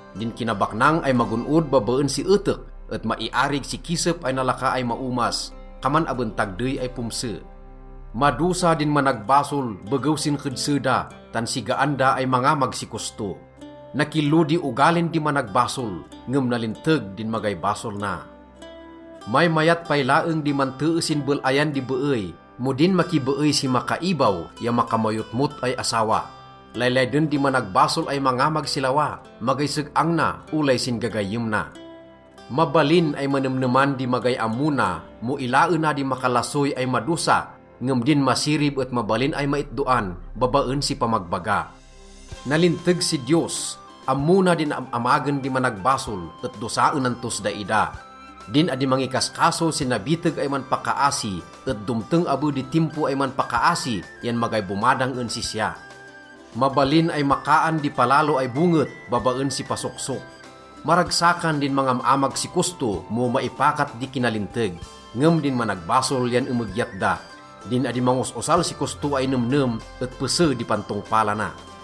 Din kinabaknang ay magon-od babaen si etek et maiarig si kisep ay nalaka ay maomas. Kaman aben tagdey ay pomse. Madosa din managbasol begew sin kedse da, tan sigaan da ay mangamag si kosto. Nakillo di ogalin di managbasol, ngem nalinteg din magay basol na. Maymayat pay laeng di mantee sin bel-ayan di beey mo din makibeey si makaibaw ya makamayotmot ay asawa. Laylayden di managbasol ay mangamag si lawa. Magay seg-ang na, olay sin gagayyem na. Mabalin ay manemneman di magay ammo na mo ilaena di makalasoy ay madosa, ngem din masirib et mabalin ay maitdoan babaen si pamagbaga. Nalinteg si Diyos. Ammo na din am-amagen di managbasol et dosaenan tos daida. Din adi mangikaskaso sin nabiteg ay manpakaasi et domteng abe di timpo ay manpakaasi yan magay bomadang en sisya. Mabalin ay makaan di palalo ay bonget babaen si pasoksok. Maragsakan din mangam-amag si kosto mo maipakat di kinalinteg, ngem din managbasol yan emegyat da. Din adi mangos-osal si kosto ay nemnem et pese di pantongpalana.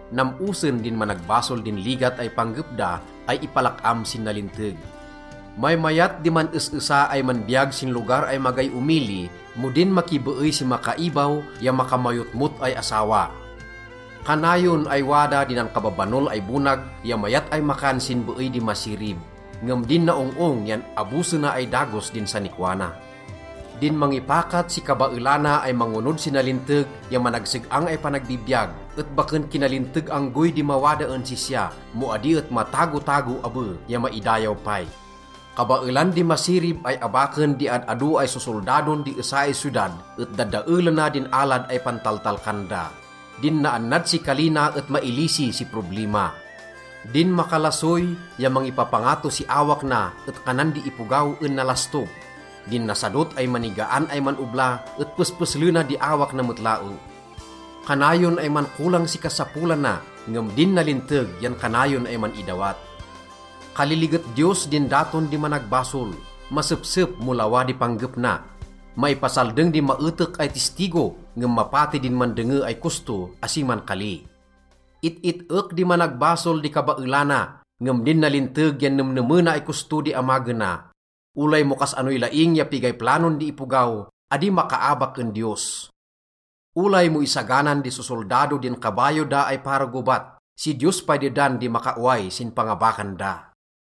Nam-osen din managbasol din ligat ay panggep da ay ipalak-am sin nalinteg. Maymayat di man-es-esa ay manbiyag sin lugar ay magay omili mo din makibeey si makaibaw ya makamayotmot ay asawa. Kanayon ay wada di nankababanol ay bonag ya mayat ay makan sin beey di masirib, ngem din naong-ong yan abosena ay dagos din sanikwa na. Din mangipakat si kabaelana ay mangonod si nalinteg ya managseg-ang ay panagbibiyag et baken kinalinteg anggoy di mawada en sisya, mo adi et matagotago abe ya maidayaw pay. Kabaelan di masirib ay abaken di ad-ado ay sosoldadon di esa ay siyodad et dadaelena din alad ay pantaltalkan da. Din naannad si kali na et mailisi si problima. Din makalasoy ya mangipapangato si awak na et kanan di ipogaw en nalastog. Din nasadot ay manigaan ay man-obla et pespeslena di awak na met laeng. Kanayon ay mankolang si kasapolana, ngem din nalinteg yan kanayon ay man-idawat. Kaliliget Diyos din daton di managbasol, masepsep mo lawa di panggep na. Maipasaldeng di maetek ay tistigo, ngem mapati din mandenge ay kosto, asi mankali. It-it-ek di managbasol di kabaelana, ngem din nalinteg yan nemnemena ay kosto di amagena. Olay mo kas-anoy laing ya pigay planon di ipogaw, adi makaabak en Diyos. Olay mo isaganan di sosoldado din kabayo da ay para gobat, si Diyos pay dedan di makaoway sin pangabakan da.